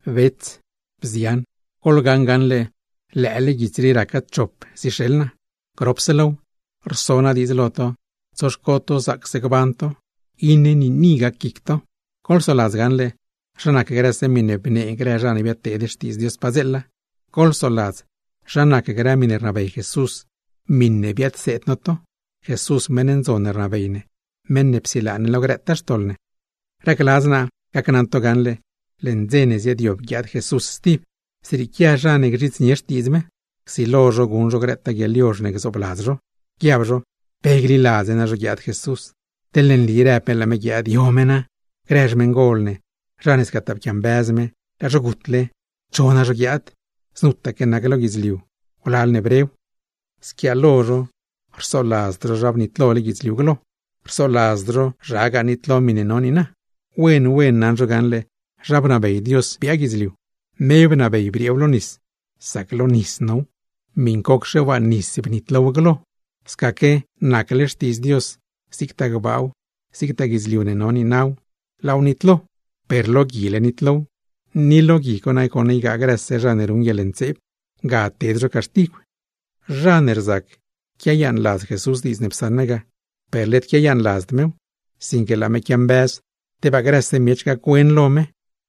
Bets, bzian, goḻgaṉ gaṉle lëële guits rii raca chop zixeḻ naa. Gropse low, rso naa diidz lo to tsoxco to zaacse gban to, iṉe niini gac guic to. Goḻsoladz gaṉle, zha nac grëse miṉe bnee grë zha ne biadteed xtiidz Dios padzeela; goḻsoladz zha nac grë miṉe rnabey Jesús, miṉe biadseed no to. (Jesús, meṉ ndzon ne rnabey ne, meṉ ne psilaa ne lo grëtaa xtoḻ ne.) Racladz naa gacnaṉ to gaṉle, leṉ dze ne ziaadyob guiaad Jesús, zrieequia zha ne gzhidznie xtiidz me, csilo zho guṉ zho grëtaa guieḻyozh ne gzoobladz zho; guiab zho: “¡Pe gliladz ne nazho guiaad Jesús! Teḻne nli rëb me laa me guiaad, ¿yo me na? Grë xmeṉgol ne, zha ne scataa pquiambëz me, laa zho gutle, ¿cho na zho guiaad? Znutaque nac lo guidzliu wlal ne brew.” Squiaalo zho rsoladzd zho zha bnitlole guidzliu tib vuelt, ni zhagaa nitlo miṉe no niina. Wen wen naṉ zho gaṉle zha bnabey Dios biaa guidzliu, me bnabey brieew lo nis, ni masaque lo nis now; miṉcocxe waa nis bnitlow glo. Scaque, nacle xtiidz Dios, zigtaa gbaaw, zigtaa guidzliu ne no niinaw, laaw nitlo, per lo guile nitlow; ni lo gui co nagoṉ ygaa grëse zha ne ruṉ guieḻntseeb ted zho caxtigw. Zha ne rzac quiayaaṉladz Jesús diidz ne psaṉ me ga, per led quiayaaṉladzd mew; sinque laa me quiambëz tebaa grëse miech gac-wen lo me.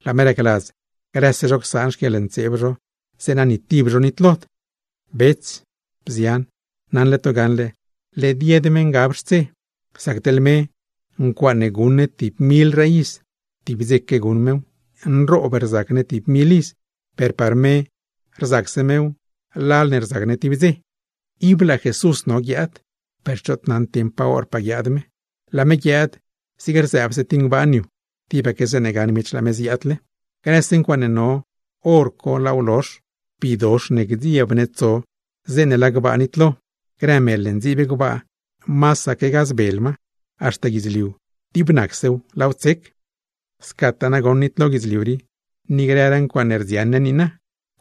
Laa me racladz, grëse zho csaan xquieḻntseeb zho, zeeṉa ni tib zho nitlod. Bets, bzian, naṉle to gaṉle led yed me ngab xtse. Sac teḻ me, ncuaaṉe guṉ ne tib milraa iz, tib dzeque guṉ mew; nroob rzac ne tib mil iz, per par me rzacse mew, lal ne rzac ne tib dze. Ib laa me no guiaad, per choot naṉd dieṉ pa horpaa guiaad me; laa me guiaad zig rzëëbse tib ngbaan yu, tibaque zeeṉe gaṉ miech laa me ziaadle. Grëse ncuaaṉe no, hor co laaw lozh; bidox ne gdzieb ne tso zeeṉe laa gbaa nitlo; grë mel ne ndziib gbaa, masaque gazbel ma; haxta guidzliu, dib nacsew laaw tsec. Scataa nagoṉ nitlo guidzliu rii, ni grëraa ncuaaṉe rdziaṉ ne niina,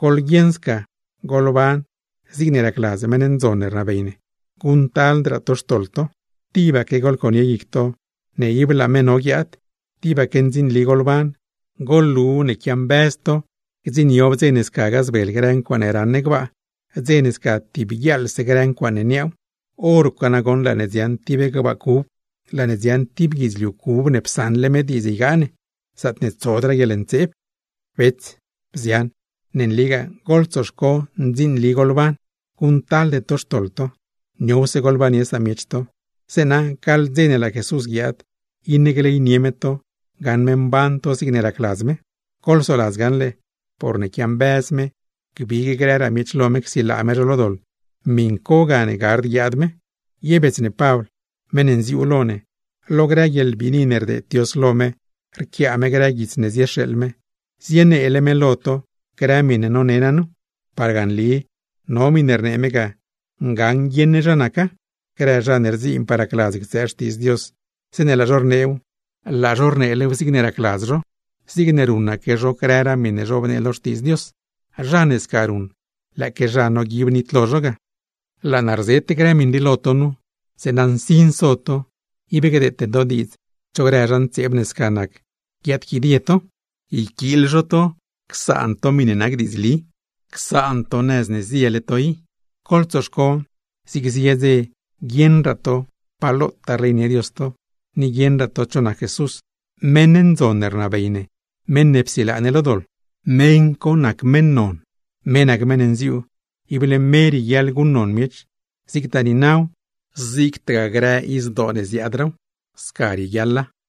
¡goḻguieṉ sca goḻban zigne racladz meṉ ndzon ne rnabey ne, guṉctaldraa to xtoḻ to! Tibaque goḻconie guic to ne ib laa me no guiaad; tibaque ndzinli goḻban, goḻlu ne quiambëz to gdziṉniob dze ne sca gazbel grë ncuaaṉe raṉ ne gbaa, dze ne sca tib guiaaḻse grë ncuaaṉe niaaw. Horco nagoṉ laa ne dziaṉ tib gbaa cub, laa ne dziaṉ tib guidzliu cub ne psaṉle me diidz ygaa ne; zaatne tsodraa guieḻntseeb. Bets, bzian, nligaa goḻtsoxco ndzinli goḻban, guṉctalde to xtoḻ to; niowse goḻbannie samiech to, zeeṉa gaḻ dze ne laa Jesús guiaad, iṉe gleynie me to gaṉ me mban to zigne racladz me. Goḻsoladz gaṉle, porne quiambëz me gbig grëraa miech lo me csilaa me zho lo doḻ, miṉ co gane gard guiaad me. Ye bets ne Pabl, meṉ ne nziuu lo ne, lo grë guieḻbiini ne rdeed Dios lo me rquiaa me grë guits ne zixeeḻ me, zineele me lo to grë miṉe none naa nu. Parga nli no miṉe rnee me ga, ngaṉ guieṉ ne zha naca; grë zha ne rdziinpaa racladz ctsëë Xtiidz Dios, zeeṉe laa zho rneew, laa zho rneelew zigne racladz zho; zigne ruṉaque zho grëraa miṉe zhobnee lo Xtiidz Dios. Zha ne sca ruṉ, lëëque zha noguib nitlo zho ga. Laa naa rzet grë miṉ rii lo to nu, zeeṉa nsin so to, ib gdeete to diidz cho grë zha ntseeb ne sca nac guiaadquidie to, yquiil zho to csaan to miṉe nac diidzli, csaan to nëz ne ziele to i. Goḻtsoxco zig zie dze guieṉraa to pa lotaa rleynie Dios to, ni guieṉraa to cho nac Jesús, meṉ ndzon ne rnabey ne, meṉ ne psilaa ne lo doḻ. Me nac meṉ non, me nac meṉ nziuu, ible me rieguiaḻ guṉnon miech, zigtaa niinaw, zigtagaa grë izdoo ne ziaadraaw. Sca rieguiaḻa. Pedr